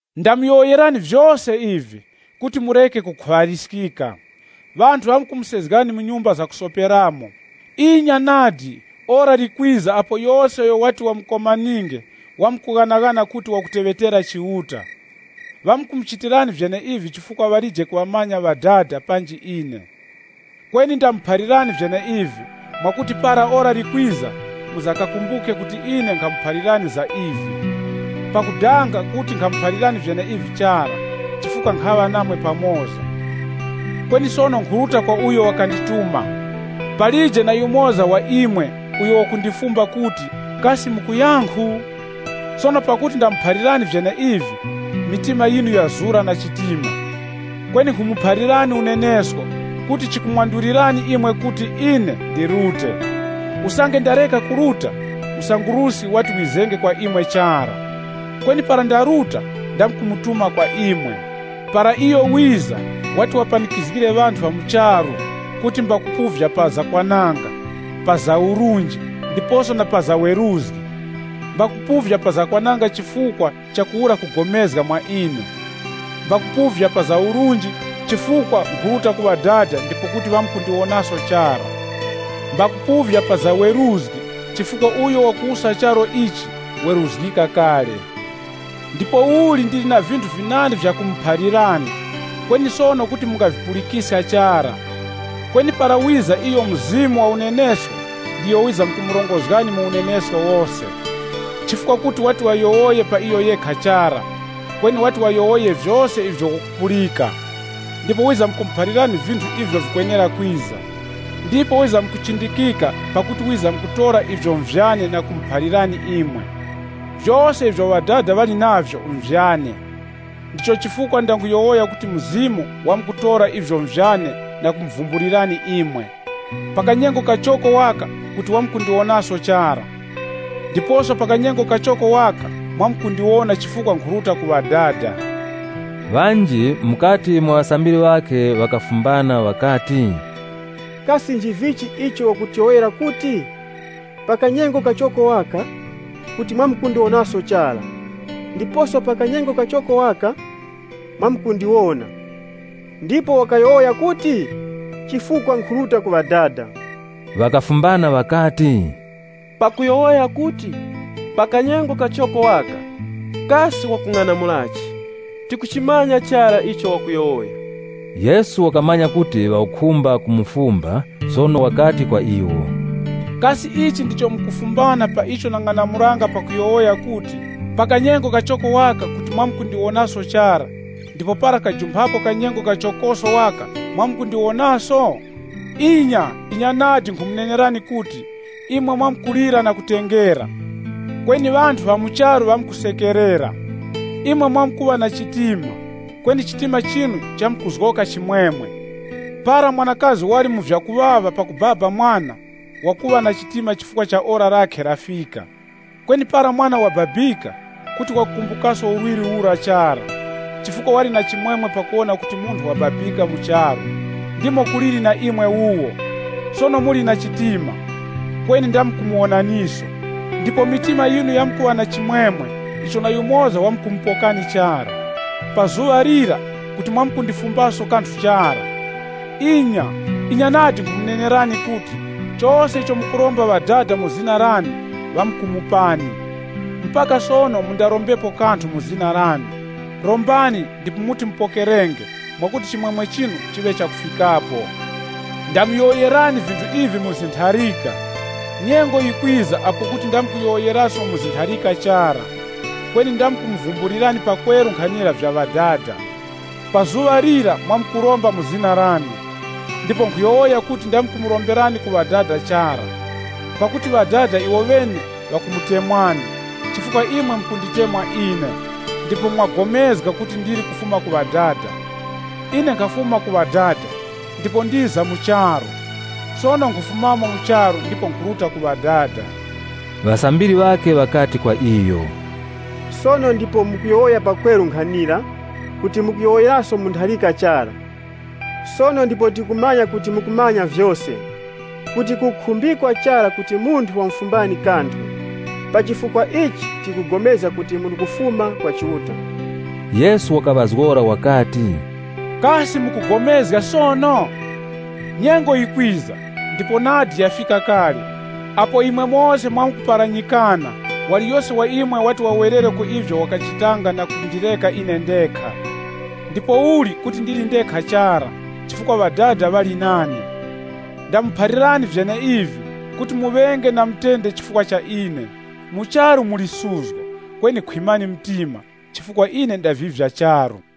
“Ndamuyowoyerani vyose ivi, kuti mureke kukhuŵaliskika. Ŵanthu ŵamkumusezgani mu nyumba zakusoperamo. Inya nadi, ora likwiza apo yose uyo wati wamukomaninge wamkughanaghana kuti wakuteŵetera Chiuta. Ŵamkumuchitirani vyeneivi chifukwa ŵalije kuŵamanya Ŵadada panji ine. Kweni ndamuphalirani vyeneivi mwakuti para ora likwiza, mwiza kakumbuke kuti ine nkhamuphalirani za ivi. Mlimo wa Mzimu Mutuŵa “Pakudanga kuti nkhamuphalirani vyeneivi chara, chifukwa nkhaŵa namwe pamoza. Kweni sono nkhuruta kwa uyo wakandituma. Palije na yumoza wa imwe uyo wakundifumba kuti, ‘Kasi mukuyankhu?’ Sono pakuti ndamuphalirani vyeneivi, mitima yinu yazura na chitima. Kweni nkhumuphalirani unenesko kuti chikumwandulirani imwe kuti ine ndirute. Usange ndareka kuruta, Msanguruski wati wizenge kwa imwe chara. Kweni para ndaruta ndamkumutuma kwa imwe. Para iyo wiza wati wapanikizgire ŵanthu ŵa mu charu kuti mbakupuvya pa za kwananga, pa za urunji, ndiposo na pa za weruzgi. Mbakupuvya pa za kwananga chifukwa chakuwura kupulikana mwa ine. Mbakupuvya pa za urunji, chifukwa nkhuruta ku Ŵadada ndipo kuti mwamkundiwonaso chara. Mbakupuvya pa za weruzgi, chifukwa uyo wakuwusa charu ichi weruzgika kale. “Ndipouli ndili na vinthu vinandi vyakumuphalirani, kweni sono kuti mungavipulikiska chara. Kweni para wiza iyo Mzimu wa unenesko, ndiyo wizamkumurongozgani mu unenesko wose. Chifukwa kuti wati wayowoye pa iyo yekha chara, kweni wati wayowoye vyose ivyo wakupulika. Ndipo wizamkumuphalirani vinthu ivyo vikwenera kwiza. Iyo wizamkundichindika pakuti wizamkutora ivyo nvyane na kumuphalirani imwe. Vyose ivyo Ŵadada ŵali navyo nvyane. Ndicho chifukwa ndanguyowoya kuti Mzimu wamkutora ivyo nvyane na kumuphalirani imwe. “Pa kanyengo kachoko waka kuti mwamkundiwonaso chara. Ndiposo pa kanyengo kachoko waka, mwamkundiwona chifukwa nkhuruta ku Ŵadada.” Ŵanji mukati mwa ŵasambiri ŵakhe ŵakafumbana ŵakati, “Kasi nchivichi icho wakutiyowoyera kuti, ‘Pa kanyengo kachoko waka, kuti mwamkundiwonaso chara, ndiposo pa kanyengo kachoko waka, mwamkundiwona?’ Ndipo wakayowoya kuti, ‘Chifukwa nkhuruta ku Ŵadada.’” Ŵakafumbana ŵakati, “Pakuyowoya kuti, ‘Pa kanyengo kachoko waka’ kasi wakung'anamulachi? Tikuchimanya chara icho wakuyowoya.” Yesu wakamanya kuti ŵakukhumba kumufumba, sono wakati kwa iwo, “Kasi ichi ndicho mukufumbana pa icho nang'anamulanga pakuyowoya kuti, ‘Pa kanyengo kachoko waka, kuti mwamkundiwonaso chara, ndipo para kajumphapo kanyengo kachokoso waka mwamkundiwonaso?’ Inya, inya nadi nkhumunenerani kuti, imwe mwamkulira na kutengera, kweni ŵanthu ŵa mu charu ŵamkusekerera. Imwe mwamkuŵa na chitima, kweni chitima chinu chamkuzgoka chimwemwe. Para mwanakazi wali mu vyakuŵaŵa pakubaba mwana, wakuŵa na chitima chifukwa ora lakhe lafika. Kweni para mwana wababika, kuti wakukumbukaso urwirwi ura chara, chifukwa wali na chimwemwe pakuwona kuti munthu wababika mu charu. Ndimo kuliri na imwe wuwo. Sono muli na chitima, kweni ndamkumuwonaniso. Ndipo mitima yinu yamkuŵa na chimwemwe icho na yumoza wamkumupokani chara. “Pa zuŵa lira, kuti mwamkundifumbaso kanthu chara. Inya, inya nadi nkhumunenerani kuti, chose icho mukuromba Ŵadada mu zina lane ŵamkumupani. Mpaka sono mundarombepo kanthu mu zina lane. Rombani ndipo muti mupokerenge mwakuti chimwemwe chinu chiŵe chakufikapo. “Ndamuyowoyerani vinthu ivi mu zintharika. Nyengo yikwiza apo kuti ndamkuyowoyeraso mu zintharika chara. Kweni ndamkumuvumbulirani pakweru nkhanira vya Ŵadada. Pa zuŵa lira, mwamkuromba mu zina lane. Ndipo nkhuyowoya kuti ndamkumuromberani ku Ŵadada chara. Pakuti Ŵadada iwoŵene ŵakumutemwani, chifukwa imwe mukunditemwa ine ndipo mwapulikana kuti ndili kufuma ku Ŵadada. Ine nkhafuma ku Ŵadada, ndipo ndiza mu charu. Sono nkhufumamo mu charu ndipo nkhuruta ku Ŵadada.” Ŵasambiri ŵakhe ŵakati kwa iyo, “Sono ndipo mukuyowoya pakweru nkhanira, kuti mukuyowoyeraso mu ntharika chara. Sono ndipo tikumanya kuti mukumanya vyose kuti kukukhumbikwa chara kuti munthu wamufumbani kanthu. Pa chifukwa ichi tikupulikana kuti muli kufuma kwa Chiuta.” Yesu wakaŵazgora wakati, “Kasi mukupulikana sono? Nyengo yikwiza ndipo nadi yafika kale, apo imwe mose mwamkuparanyikana waliyose wa imwe wati wawerere ku ivyo wakachitanga na kundireka ine ndekha. Ndipouli kuti ndili ndekha chara, chifukwa Ŵadada ŵali nane. Ndamuphalirani vyeneivi, kuti muŵenge na mutende chifukwa cha ine. Mu charu muli suzgo, kweni khwimani mtima, chifukwa ine ndavivya charu.”